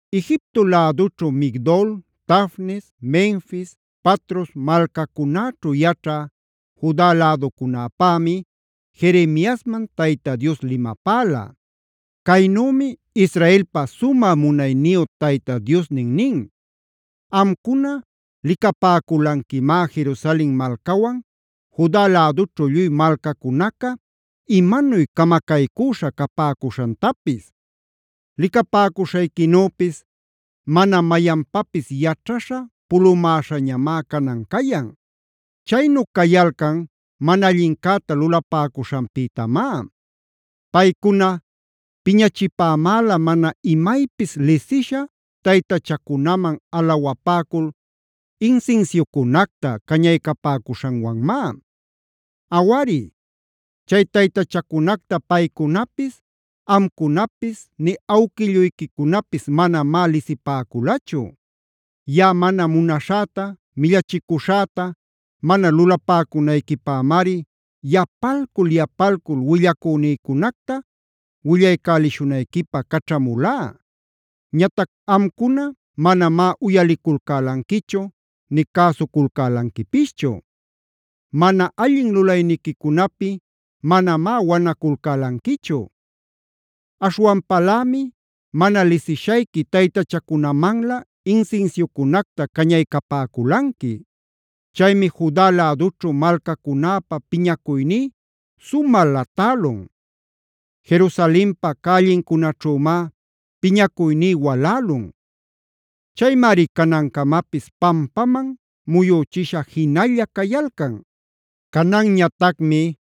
Egipto lädućhu Migdol, Tafnes, Menfis, Patros malcacunäćhu yaćhä Juda läducunäpämi Jeremiasman Tayta Dios limapäla. Caynümi Israelpa sumä munayniyu Tayta Diosnin nin: “Amcuna licapäculanquimá Jerusalen malcawan Juda lädućhu lluy malcacunaca imanuy camacaycüśha capäcuśhantapis. Licapäcuśhayquinüpis mana mayanpapis yaćhaśha pulumäśhañamá canan cayan. Chaynu cayalcan mana allincäta lulapäcuśhanpïtamá. Paycuna piñachipämäla mana imaypis lisisha taytachacunaman alawapäcula insinsiucunacta cañaycapäcuśhanwanmá. Awari, chay taytachacunacta paycunapis, amcunapis nï awquilluyquicunapis manamá lisipäculachu. Yaꞌa mana munaśhäta, millachicuśhäta mana lulapäcunayquipämari yapalcul-yapalcul willacünïcunacta willaycälishunayquipä caćhamulá. Ñatac amcuna manamá uyaliculcälanquichu nï cäsuculcälanquipischu. Mana allin lulayniquicunapi manamá wanaculcälanquichu. Aśhwanpalämi mana lisishayqui taytachacunamanlä insinsiucunacta cañaycapäculanqui. Chaymi Juda lädućhu malcacunäpä piñacuyní sumä latälun; Jerusalenpa cällincunaćhümá piñacuyní walälun. Chaymari canancamapis pampaman muyüchisha jinalla cayalcan. “Cananñatacmi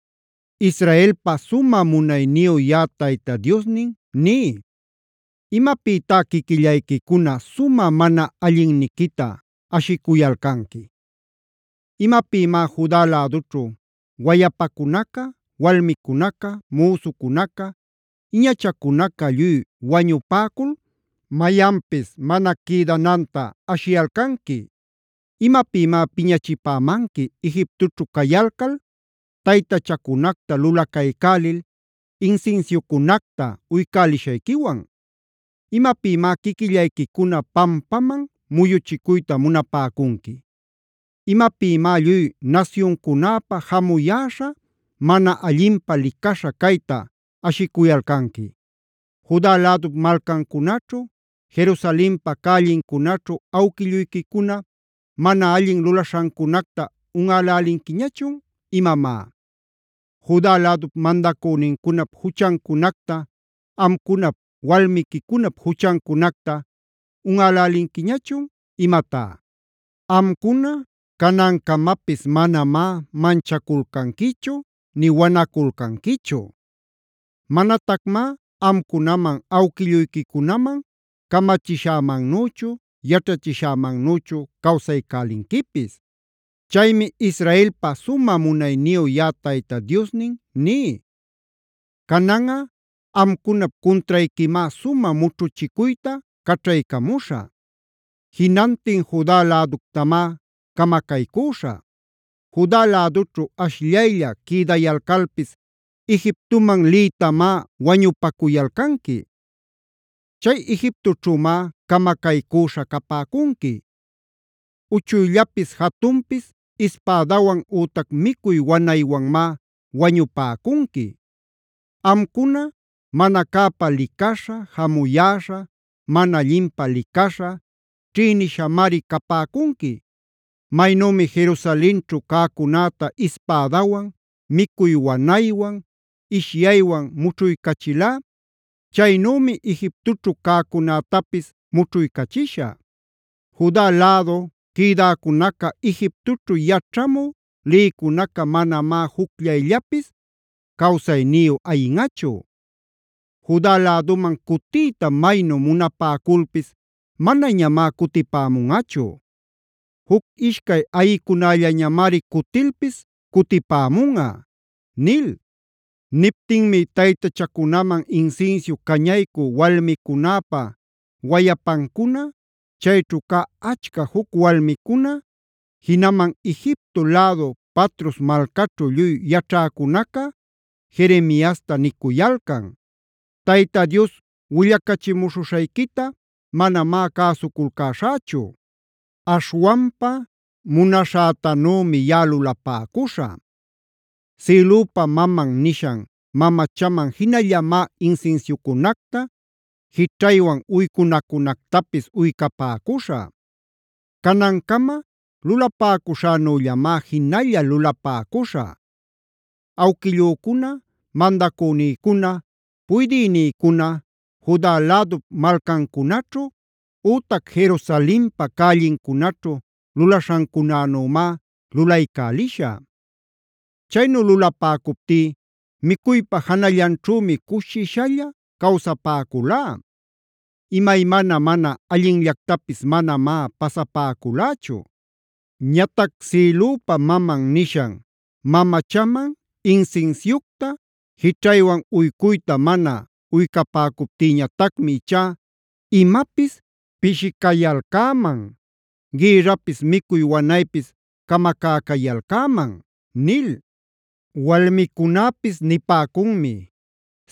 Israelpa sumä munayniyu yaꞌa Tayta Diosnin ní: ¿Imapïtá quiquillayquicuna sumä mana allinniquita ashicuyalcanqui? ¿Imapïmá Juda lädućhu wayapacunaca, walmicunaca, müsucunaca, iñachacunaca lluy wañupäcul mayanpis mana quïdanantachun ashiyalcanqui? ¿Imapïmá piñachipämanqui Egiptoćhu cayalcal taytachacunacta lulacaycälil insinsiucunacta uycälishayquiwan? ¿Imapïmá quiquillayquicuna pampaman muyuchicuyta munapäcunqui? ¿Imapïmá lluy nasyuncunäpa jamuyäśha mana allinpä licaśha cayta ashicuyalcanqui? ¿Juda lädup malcancunaćhu, Jerusalenpa cällincunaćhu awquilluyquicuna mana allin lulaśhancunacta unꞌälälinquiñachun imamá? ¿Juda lädup mandacünincunap juchancunacta, amcunap walmiquicunap juchancunacta unꞌälälinquiñachun imatá? Amcuna canancamapis manamá manchaculcanquichu nï wanaculcanquichu. Manatacmá amcunaman awquilluyquicunaman camachishämannüchu, yaćhachishämannüchu cawsaycälinquipis. “Chaymi Israelpa sumä munayniyu yaꞌa Tayta Diosnin ní: Cananꞌa amcunap cuntrayquimá sumä mućhuchicuyta caćhaycamuśhä. Jinantin Juda läductamá camacaycüśhä. Juda lädućhu ashllaylla quïdayalcalpis Egiptoman liytamá wañupacuyalcanqui. Chay Egiptoćhümá camacaycüśha capäcunqui. Uchuyllapis jatunpis ispädawan ütac micuy wanaywanmá wañupäcunqui. Amcuna mana cäpä licaśha, jamuyäśha, mana allinpä licaśha, ćhïnishamari capäcunqui. Maynümi Jerusalenćhu cäcunäta ispädawan, micuy wanaywan, ishyaywan mućhuycachilá, chaynümi Egiptoćhu cäcunätapis mućhuycachishä. Juda lädu quïdäcunaca Egiptoćhu yaćhamü lïcunaca manamá jucllayllapis cawsayniyu ayinꞌachu. Juda läduman cutiyta maynu munapäculpis manañamá cutipämunꞌachu. Juc-ishcay ayïcunällañamari cutilpis cutipämunꞌa” nil. Niptinmi taytachacunaman insinsiu cañaycü walmicunäpa wayapancuna, chayćhu cä achca juc walmicuna, jinaman Egipto lädu Patros malcaćhu lluy yaćhäcunaca Jeremiasta nicuyalcan: “Tayta Dios willachimuśhuśhayquita manamá cäsuculcäśhächu. Aśhwanpa munaśhätanümi yaꞌa lulapäcuśhä. Sïlüpa Mamanb nishan mamachaman jinallamá insinsiucunacta, jićhaywan uycunacunactapis uycapäcuśhä. Canancama lulapäcuśhänüllamá jinalla lulapäcuśhä. Awquillücuna, mandacünïcuna, puydïnïcuna, Juda lädup malcancunaćhu ütac Jerusalenpa cällincunaćhu lulaśhancunänümá lulaycälishä. Chaynu lulapäcuptí micuypa janallanćhümi cushishalla cawsapäculá; imaymana mana allinllactapis manamá pasapäculächu. Ñatac Sïlüpa Maman nishan mamachaman insinsiucta, jićhaywan uycuyta mana uycapäcuptïñatacmi ichá imapis pishicayalcäman; gïrrapis micuy wanaypis camacäcayalcäman” nil. Walmicunäpis nipäcunmi: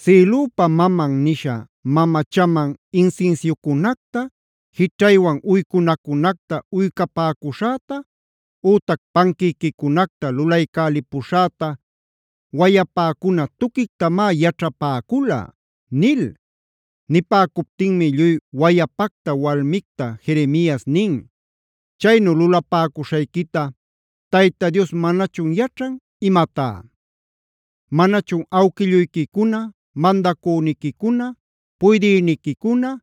“Sïlüpa Maman nisha mamachaman insinsiucunacta, jićhaywan uycunacunacta uycapäcuśhäta ütac panquïquicunacta lulaycälipuśhäta wayapäcuna tuquictamá yaćhapäcula” nil. Nipäcuptinmi lluy wayapacta walmicta Jeremias nin: “¿Chaynu lulapäcuśhayquita Tayta Dios manachun yaćhan imatá? ¿Manachun awquilluyquicuna, mandacüniquicuna, puydïniquicuna,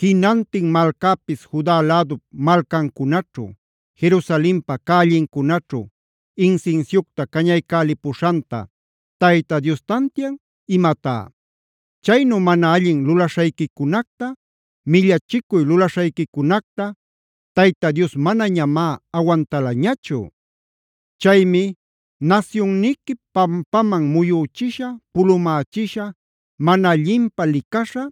jinantin malcäpis Juda lädup malcancunaćhu, Jerusalenpa cällincunaćhu insinsiucta cañaycälipuśhanta Tayta Dios tantian imatá? Chaynu mana allin lulaśhayquicunacta, millachicuy lulaśhayquicunacta Tayta Dios manañamá awantalañachu. Chaymi nasyunniqui pampaman muyüchisha, pulumächisha, mana allinpä licaśha,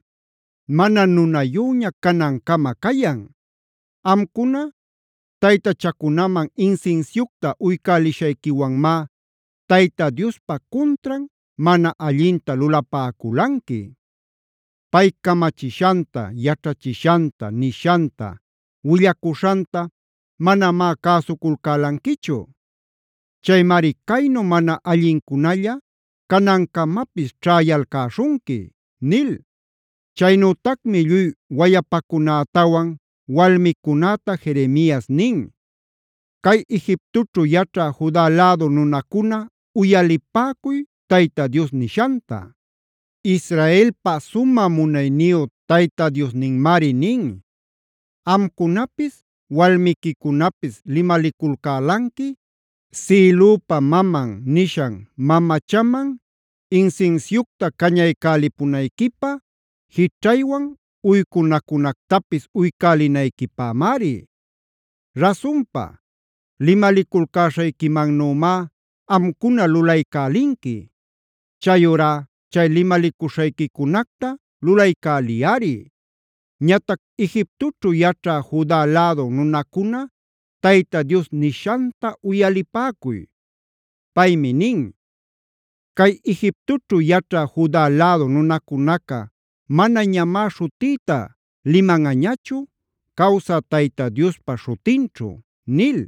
mana nunayüña canancama cayan. Amcuna taytachacunaman insinsiucta uycälishayquiwanmá Tayta Diospa cuntran mana allinta lulapäculanqui. Pay camachishanta, yaćhachishanta, nishanta, willacuśhanta manamá cäsuculcälanquichu. Chaymari caynu mana allincunälla canancamapis ćhäyalcäśhunqui” nil. Chaynütacmi lluy wayapacunätawan walmicunäta Jeremias nin: “Cay Egiptoćhu yaćhä Juda lädu nunacuna uyalipäcuy Tayta Dios nishanta. Israelpa sumä munayniyu Tayta Diosninmari nin: ‘Amcunapis walmiquicunapis limaliculcälanqui Sïlüpa Maman nishan mamachaman insinsiucta cañaycälipunayquipä, jićhaywan uycunacunactapis uycälinayquipämari. Rasunpa, limaliculcäśhayquimannümá amcuna lulaycälilanqui. Chayurá chay limalicuśhayquicunacta lulaycäliyꞌari. “ ‘Ñatac Egiptoćhu yaćhä Juda lädu nunacuna Tayta Dios nishanta uyalipäcuy. Paymi nin: “Cay Egiptoćhu yaćhä Juda lädu nunacunaca manañamá śhutïta limanꞌañachu Cawsä Tayta Diospa śhutinćhu” nil.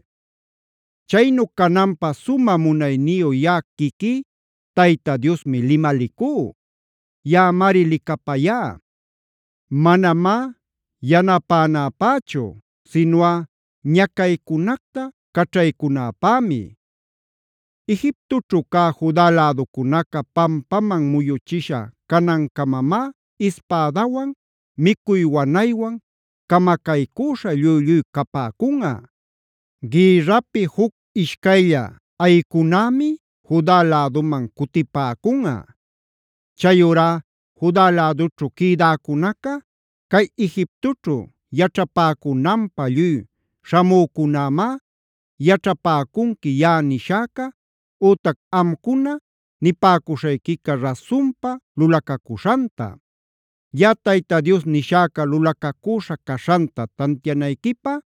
Chaynu cananpä sumä munayniyu yaꞌa quiquí Tayta Diosmi limalicú. Yaꞌamari licapayá, manamá yanapänäpächu sinuꞌa ñacaycunacta caćhaycunäpämi. Egiptoćhu cä Juda läducunaca pampaman muyuchisha canancamamá ispädawan, micuy wanaywan camacaycüśha lluy-lluy capäcunꞌa. Gïrrapi juc ishcaylla ayicünämi Juda läduman cutipäcunꞌa. Chayurá Juda lädućhu quïdäcunaca cay Egiptoćhu yaćhapäcunanpä lluy śhamücunämá yaćhapäcunqui yaꞌa nishäca ütac amcuna nipäcuśhayquica rasunpa lulacacuśhanta. Yaꞌa Tayta Dios nishäca lulacacüśha caśhanta tantianayquipä,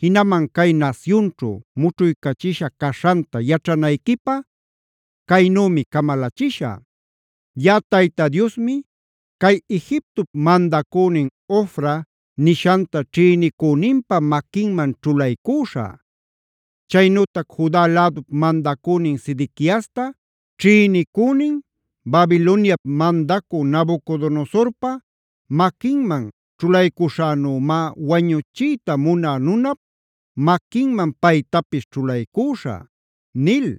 jinaman cay nasyunćhu mućhuycachisha caśhanta yaćhanayquipä caynümi camalachishä: Yaꞌa Tayta Diosmi cay Egiptop mandacünin Hofra nishanta ćhïnicüninpa maquinman ćhulaycüśhä. Chaynütac Juda lädup mandacünin Sedequiasta ćhïnicünin Babiloniap mandacüc Nabucodonosorpa maquinman ćhulaycuśhänümá wañuchiyta munä nunap maquinman paytapis ćhulaycüśhä’” nil.